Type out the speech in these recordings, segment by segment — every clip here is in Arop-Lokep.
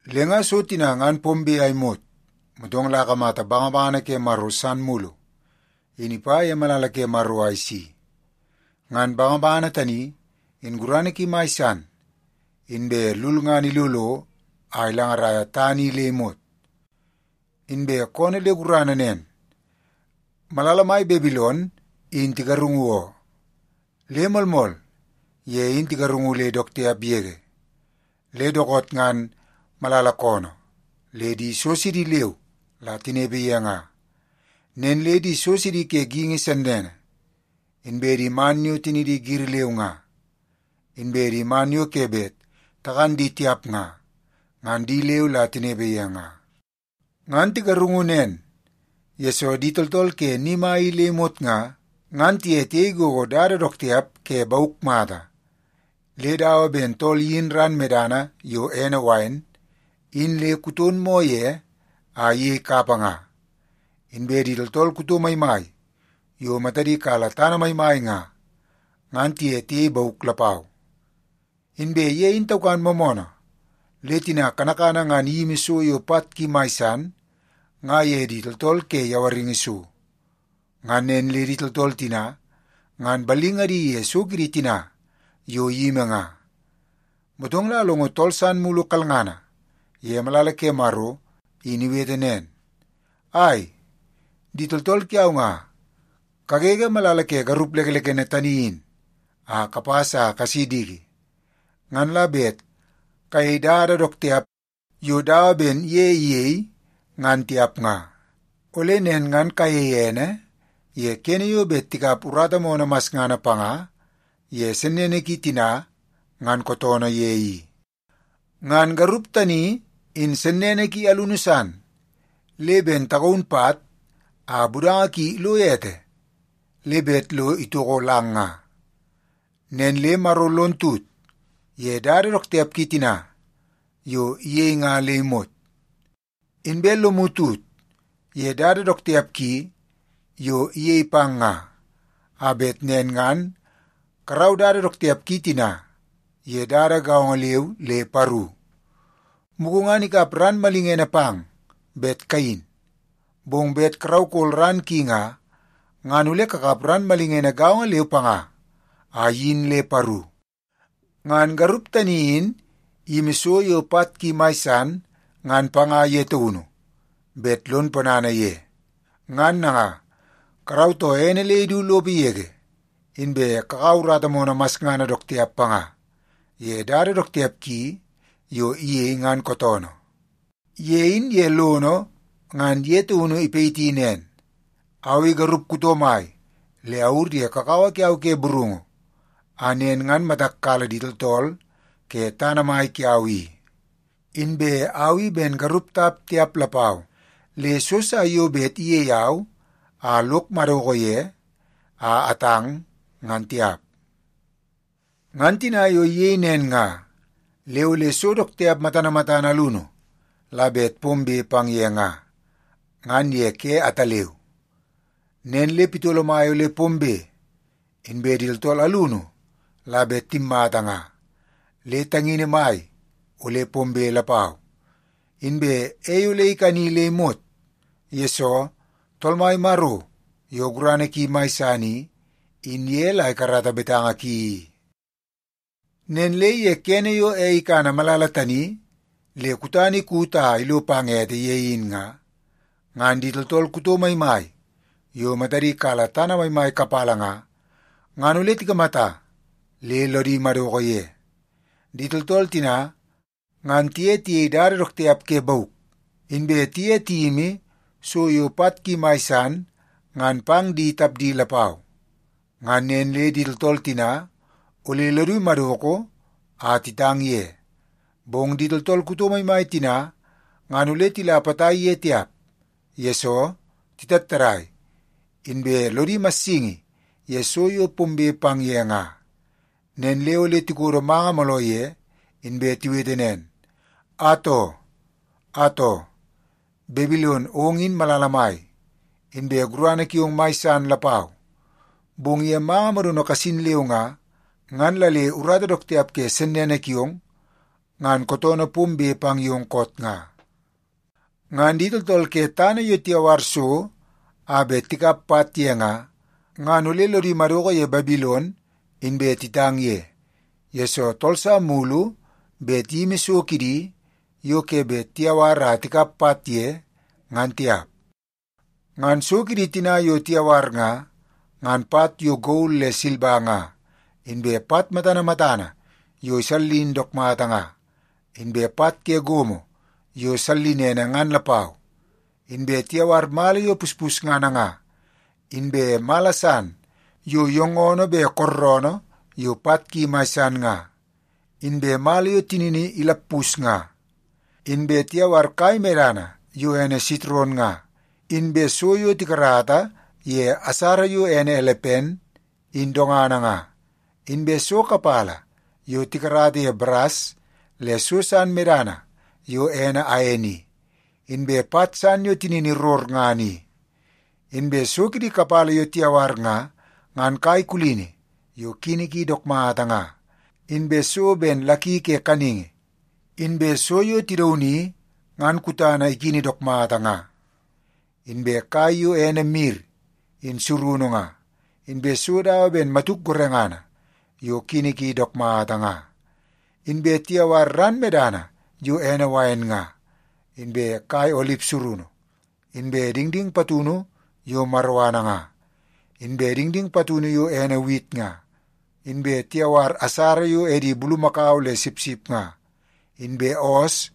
Le nga so tina ngan pombe a imot, motong la akamata bangabangana ke Maro san mulu in ipa ye malala ke Maro a isi. Ngan bangabangana tani in gurana ki mai san, inbe lulngana ilolo a ilangaraia tana i le imot. Inbe koonoo le gurana nen, “Malala mai Babilon in tigarungu oo. Le moolmool, ye in tigarungu le dook tiap yege. Le dookoot ngan malala koonoo le di so sidi leu la tinepe ye nga. Nen le di so sidi ke geingi sennene, inbe di man yo tinidi giri leu nga, inbe di man yo ke bet takan di tiap nga, ngan di leu la tinepe ye nga. Ngan tigarungu nen, yesoo di tooltool ke ni mai i le imot nga, ngan tiye tiyei gogo dada dook tiap ke bauk mata, le dawa ben tool iyin ran medana yo ene wain in le kuton moo ye a iyei kapa nga. Inbe di tooltool kuto maimai yo matadi kala tana maimai nga, ngan tiye tiyei bauk lapau. Inbe ye in taukan moomoonoo le tina kanakana ngan iyimi so yo pat ki mai san nga ye di tooltool ke yawaringi so. Ngan nen le di tooltool tina ngan ballingadi ye so kidi tina yo iyimi nga.” Motong la alongo tool san mulu kalngana ye malala ke Maro in iwete nen, “Ai, di tooltool kiau nga, kagege malala ke garup lekelekene tani in a kapas a kasi diki, ngan la bet kayei dada dook tiap yo dawa ben ye iyei ngan tiap nga. Ole nen ngan kayei ene ye kene yo bet tikap urata moonoo masngana panga ye sennene ki tina ngan kootoonoo ye i. Ngan garup tani in sennene ki alunu san le ben tagaun pat a budanga ki ilo ete le bet lo itoko lang nga. Nen le Maro lon tut ye dada dook tiap ki tina yo iyei nga le imot. Inbe lomu tut ye dada dook tiap ki yo iyei pang nga, a bet nen ngan karau dada dook tiap ki tina ye dada gaongo leu le paru. Mugu ngan ikap ran malingene pang bet kayin, bong bet karaukol ran ki nga, ngan ole kakap ran malingene gaongo leu panga a iyin le paru. Ngan garup tani in iyimi so yo pat ki mai san ngan panga ye taunu bet lon ponana ye. Ngan nanga, karautoo ene le idu lopo yege, inbe kakaua urata moonoo masngana dook tiap panga ye dada dook tiap ki yo iyei, ngan kootoonoo. Ye in ye lono ngan ye taun ipayiti nen, ‘Au i garup kuto mai le awur ye kakawa kiau ke burungu a nen ngan matak kala di tooltool ke tana mai kiau i. Inbe au i ben garup tap tiap lapau, le so sa yo bet iyei au a lok madoko ye a atang, ngan tiap.’ Ngan tina yo iyei nen nga, le ole so dook tiap matana matana alunu la bet pombe pang ye nga, ngan ye ke ataleu. Nen le pitolo mai ole pombe, inbe di tooltool alunu la bet timmata nga le tangini mai ole pombe lapau. Inbe ei ole ikani le imot, yesoo Tool Mai Maro yo gurana ki mai san i, in ye la ikarata betanga ki i. “Nen le ye kene yo ei ikana malala tani le kutana ikut a ilo pang ete ye in nga, ngan di tooltool kuto maimai yo matadi kala tana maimai kapala nga, ngan ole tikamata le lodi madoko ye. Di tooltool tina ngan tiye tiyei dada dook tiap ke bauk, inbe tiye tiyimi so yo pat ki mai san ngan pang di tapdi lapau. Ngan nen le di tooltool tina ole lodi madoko a titang ye. Bong di tooltool kuto maimai tina ngan ole tila potai ye tiap, yesoo titattadai, inbe lodi imassingi ye so yo pombe pang ye nga. Nen le ole tikodo manga mooloo ye, inbe tiwete nen, ‘Atoo! Atoo, Babilon ong in malala mai, inbe gurana kiong mai san lapau. Bong ye manga modono kasin leu nga, ngan la le urata dook tiap ke sennene kiong ngan kootoonoo pombe pang yong koot nga.’ “Ngan di tooltool ke tana yo tiyawar so a bet tikap pat ye nga, ngan ole lodi madoko ye Babilon inbe titang ye, yesoo tool sa mulu bet iyimi so kidi yo ke bet tiyawar a tikap pat ye, ngan tiap. Ngan so kidi tina yo tiyawar nga, ngan pat yo gol le silba nga, inbe pat matana matana yo isallin dook mata nga, inbe pat ke gomo yo sallinene ngan lapau. Inbe tiyawar mala yo puspusngana nga, inbe mala san yo yoongoonoo be kooroonoo yo pat ki mai san nga, inbe mala yo tinini ilappus nga. Inbe tiyawar kai medana yo ene sitron nga, inbe so yo tikarata ye asara yo ene elepen in dongana nga, inbe so kapala yo tikarata ye baras le so san medana yo ene ain i, inbe pat san yo tinini rorngana i. Inbe so kidi kapala yo tiyawar nga, ngan kai kulini yo kini ki dook mata nga, inbe so ben laki ke kaningi, inbe so yo tidauni ngan kutana ikini dook mata nga, inbe kai yo ene mir in surunu nga, inbe so dawa ben matuk gorengana yo kini ki dook mata nga. Inbe tiyawar ran medana yo ene wain nga, inbe kai olip surunu, inbe dingding patunu yo maroana nga, inbe dingding patunu yo ene wit nga. Inbe tiyawar asara yo edi bulumakau le sipsip nga, inbe oos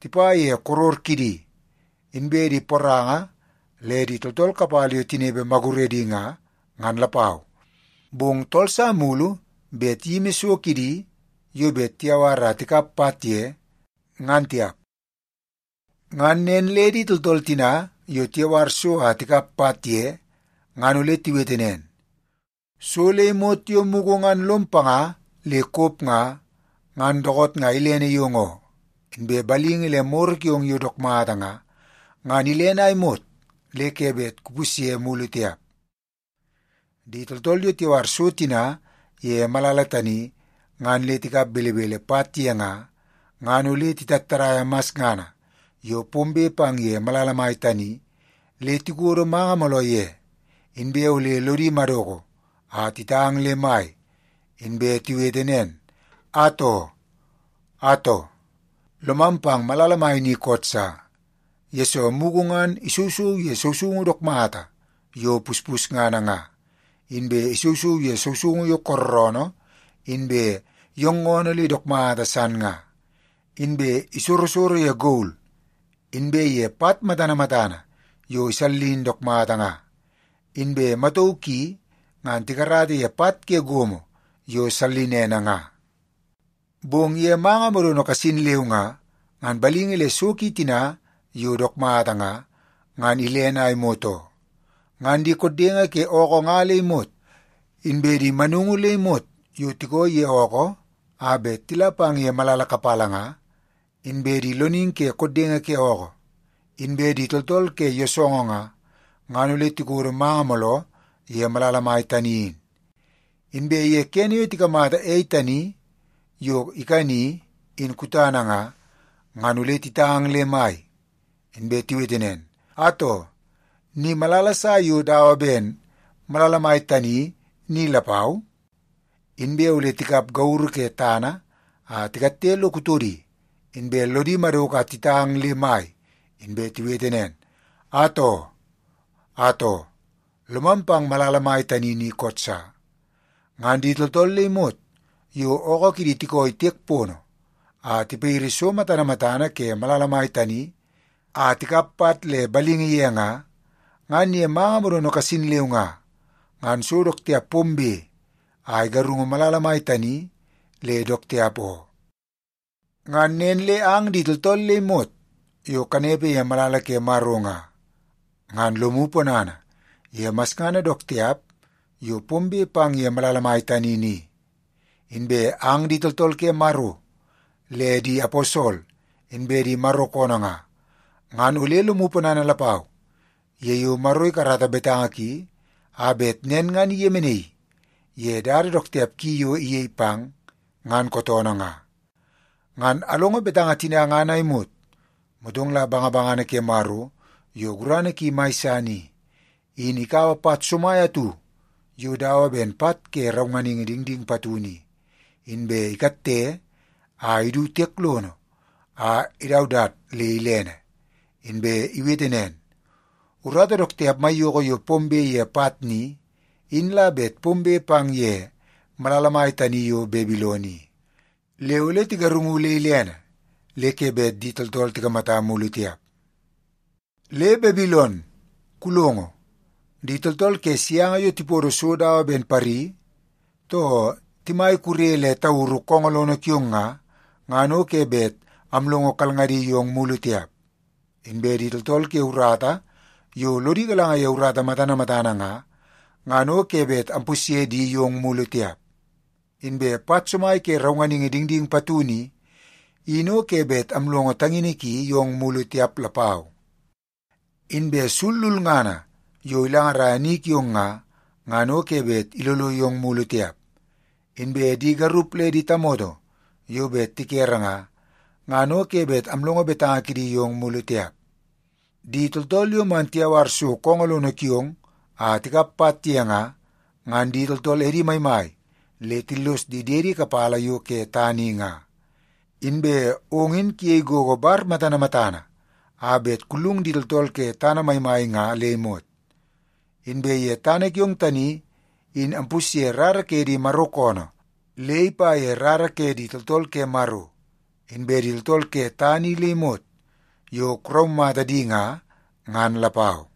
tipa ye koror kidi, inbe di poranga le di tooltool kapala yo tinepe maguredi nga, ngan lapau. Bong tool sa mulu bet iyimi so kidi yo bet tiyawar a tikap pat ye, ngan tiap. “Ngan nen le di tooltool tina yo tiyawar so a tikap pat ye ngan ole tiwete nen, ‘So le imot yo mugu ngan lom panga le kop nga, ngan dookoot nga ilene yong oo. Inbe balingi le moro kiong yo dook mata nga, ngan ilene a imot le ke bet kupusye mulu tiap.’ “Di tooltool yo tiyawar so tina ye malala tani ngan le tikap belebele pat ye nga, ngan ole titattadaia masngana yo pombe pang ye malala mai tani le tikodo manga mooloo ye. Inbe ole lodi madoko a titang le mai, inbe tiwete nen, ‘Atoo! Atoo, lomam pang malala mai ni koot sa, yesoo mugu ngan isousou ye sousoungu dook mata yo puspusngana nga, inbe isousou ye sousoungu yo kooroonoo inbe yoongoonoo le dook mata san nga. Inbe isorosoro ye gol inbe ye pat matana matana yo isallin dook mata nga, inbe matauu ki ngan tikarata ye pat ke gomo yo sallinene nga. Bong ye manga modono kasin leu nga, ngan balingi le so ki tina yo dook mata nga, ngan ilene a imot oo.’ “Ngan di koddenge ke ookoo nga le imot, inbe di manungu le imot yo tikooi ye ookoo a bet tila pang ye malala kapala nga, inbe di loningi ke koddenge ke ookoo, inbe di tooltool ke yoosoongoo nga, ngan ole tikodo manga mooloo ye malala mai tani in. Inbe ye kene yo tikamata ei tani yo ikani, in kutana nga, ngan ole titang le mai, inbe tiwete nen, ‘Atoo, ni malala sa yo dawa ben malala mai tani ni lapau?’ Inbe ole tikap gauru ke tana a tikatte lo kutodi, inbe lodi madoko a titang le mai inbe tiwete nen, ‘Atoo! Atoo, lomam pang malala mai tani ni koot sa. Ngan di tooltool le imot yo ookoo kidi tikooi tiek pono a tipayiri so matana matana ke malala mai tani a tikap pat le ballingadi ye nga, ngan ye manga modono kasin leu nga, ngan so dook tiap pombe a igarungu malala mai tani le dook tiap oo. Nen le ang di tooltool le imot yo kanepe ye malala ke Maro nga, ngan lomu ponana ye masngana dook tiap yo pombe pang ye malala mai tani ni. Inbe ang di tooltool ke Maro le di aposol inbe di Maro koonoo nga, ngan ole lomu ponana lapau ye yo Maro ikarata betanga ki a bet nen ngan iyemenaii ye dada dook tiap ki yo iyei pang, ngan kootoonoo nga.’” Ngan alongo betanga tina ngan a imot, motong la bangabangana ke Maro yo gurana ki mai san i, in ikaua pat somai atu yo dawa ben pat ke raunganingi dingding patunu i, inbe ikatte a idu tiek lono a idaudat le ilene. Inbe iwete nen, “Urata dook tiap maiyoko yo pombe ye pat ni, in la bet pombe pang ye malala mai tani yo Babilon i. Le ole tigarungu le ilene le ke bet di tooltool tikamata mulu tiap. Le, Babilon, kulongo! Di tooltool ke sianga yo tipodo so dawa ben pari, too timai kure le tauru koongoo lono kiong nga, ngan o ke bet amlongo kalngadi yong mulu tiap. Inbe di tooltool ke urata yo lodi galanga ye urata matana matana nga, ngan o ke bet ampusye di yong mulu tiap. Inbe pat somai ke raunganingi dingding patunu i, in o ke bet amlongo tangini ki yong mulu tiap lapau. Inbe sul lulngana yo ilangaraia ni kiong nga, ngan o ke bet ilolo yong mulu tiap. Inbe di garup le di tamoto yo bet tikere nga, ngan o ke bet amlongo betanga kidi yong mulu tiap. Di tooltool yo man tiyawar so koongoo lono kiong a tikap pat ye nga, ngan di tooltool edi maimai le tillos di diedi kapala yo ke tana i nga. Inbe ong in kuyei gogo bar matana matana a bet kullung di tooltool ke tana maimai nga le imot. Inbe ye tana kiong tani in ampusye rara ke di Maro koonoo le ipa ye rara ke di tooltool ke Maro, inbe di tooltool ke tana i le imot yo kuraumata di nga, ngan lapau.”